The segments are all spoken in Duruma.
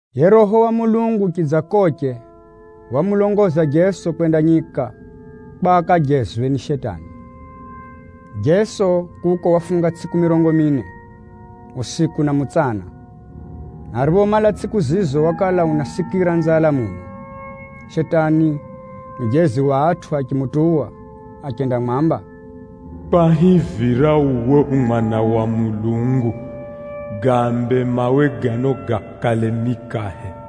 Yiye Roho wa Mulungu chidzakoche wamulongoza Jeso kwenda nyika kwa akajezwe ni Shetani. Jeso kuko wafunga tsʼiku mirongo mine usiku na mutsana, na ariphomala tsʼiku zizo wakala unasikira nzala muno. Shetani mujezi wa atʼu achimutuwa achendamwamba, “Kwahivira uwe u Mwana wa Mulungu, gaambe mawe gano gakale mikahe.”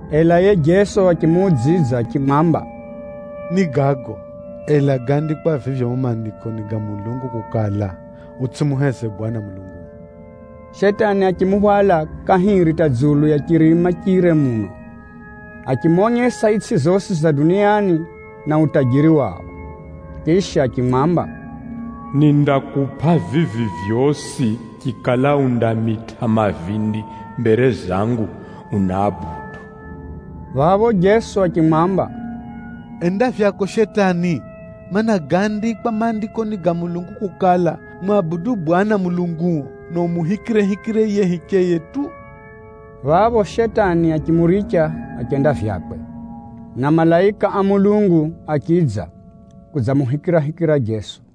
Ela yiye Jeso achimuudzidza achimwamba, “Ni gago, ela gáandikwa vivyo mumo Maandikoni ga Mulungu kukala, ‘Utsʼimuheze Bwana Mulunguo.’” Shetani achimuhwala kahiri hata dzulu ya chirima chire muno, achimonyesa itsʼi zosi za dunia na utajiri wao. Chisha achimwamba, “Nindakupʼa vivi vyosi chikala undamitʼa mavindi mbere zangu, uniabudu.” Phapho Jeso achimwamba, “Enda vyako Shetani! Maana, gáandikwa Maandikoni ga Mulungu kukala, ‘Mwabudu Bwana Mulunguo, na umuhikirehikire yiye hicheye tu.’” Phapho Shetani achimuricha achenda vyakwe, na malaika achidza, kudzamuhikirahikira Jeso.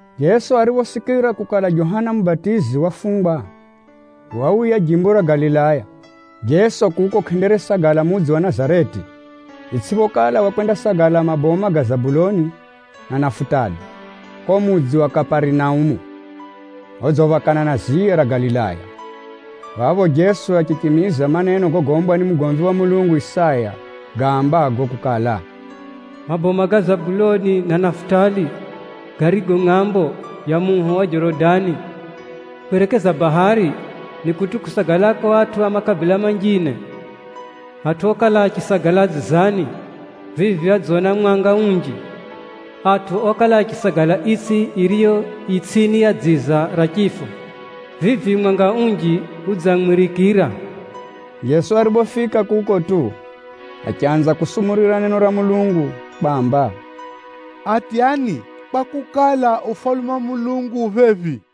Jeso ariphosikira kukala Johana Mubatizi wafungwa, wauya Galilaya. Jeso kuko kʼenderesagala mudzi wa Nazareti, itsʼiphokala wakwendasagala maboma garigo Zabuloni na Nafutali, kuko mudzi wa Kaparinaumu odziphakana na ziya ra Galilaya. Phapho Jeso achichimiza maneno gogombwa ni mugomvi wa Mulungu Isaya gaambago kukala, “Itsʼi ya Zabuloni na ya Nafutali zirizo ngʼambo ya muho wa Jorodani, kwerekeza bahari, kuko Galilaya kutʼu kusagalako atʼu a makabila manjine. Atʼu okala achisagala dzizani, vivi adzona mwanga unji. Atʼu okala achisagala itsʼi yodzifinikʼirwa ni dziza ra chifo, vivi mwanga unji udziangʼarira!” Jeso ariphofika kuko tu, achanza kusumurira neno ra Mulungu kwamba, “Atyani kwakukala, Ufalume wa Mulungu ufika phephi.”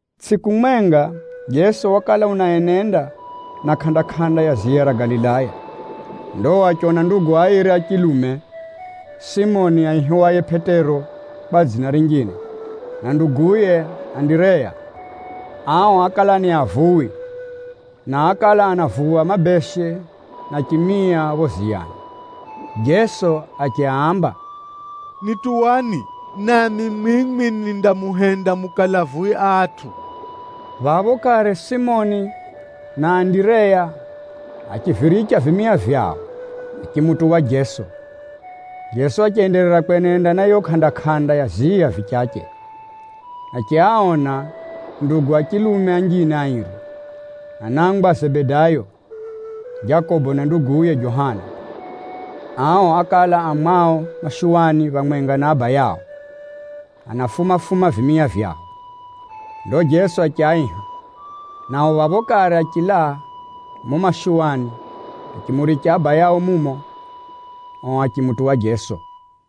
Tsʼiku mwenga, Jeso wakala unaenenda na kʼanda-kʼanda ya ziya ra Galilaya. Ndo achiona ndugu airi a chilume, Simoni aihiwaye Pʼetero kwa dzina rinjine na nduguye Andireya. Ao ákala ni avuwi na ákala anavuwa mabeshe na chimia phapho ziyani. Jeso achiaamba, “Nituwani, nami mwimwi nindamuhenda mukale avuwi a atʼu.” Phapho kare Simoni na Andireya achiviricha vimia vyao, achimutuwa Jeso. Jeso achenderera kwenenda na yiyo kʼanda-kʼanda ya ziya vichache, achiaona ndugu a chilume anjine airi, anangwa a Zebedayo, Jakobo na nduguye Johana. Ao ákala a mwao mashuwani phamwenga na abayao, anafuma-fuma vimia vyao. Ndo Jeso achiaiha. Nao phapho kare achilaa mumo mashuwani achimuricha abayao, ao achimutuwa Jeso.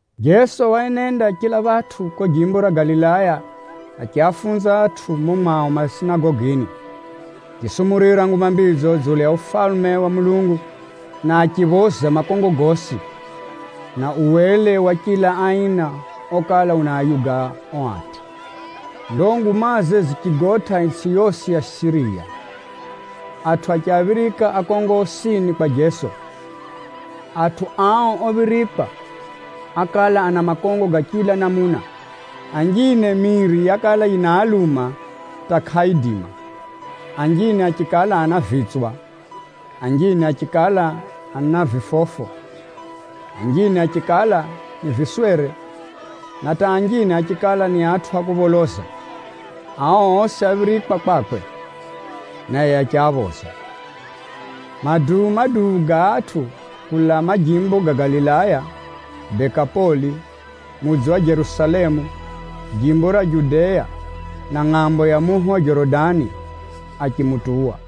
Jeso waenenda chila phatʼu kuko Galilaya achiafunza atʼu mumo mwao masinagogini, achisumurira Nguma Mbidzo dzulu ya Ufalume wa Mulungu, na achiphoza makongo gosi, na uwele wa chila aina okala unaayuga ao atʼu. Ndo ngumaze zichigotʼa itsʼi yosi ya Siriya. Atʼu achiaphirika akongo osini kwa Jeso. Atʼu ao ophirikwa ákala ana makongo ga chila namuna. Anjine miiri yakala yinaaluma hata kʼaaidima, anjine achikala ana vitswa, anjine achikala ana vifofo, anjine achikala ni viswere, na hata anjine achikala ni atʼu a kupholoza. Ao osi áphirikwa kwakwe, naye achiaphoza. Maduu-maduu ga atʼu kulaa majimbo ga Galilaya, Dekapoli, mudzi wa Jerusalemu, jimbo ra Judea na ngʼambo ya muho wa Jorodani, achimutuwa.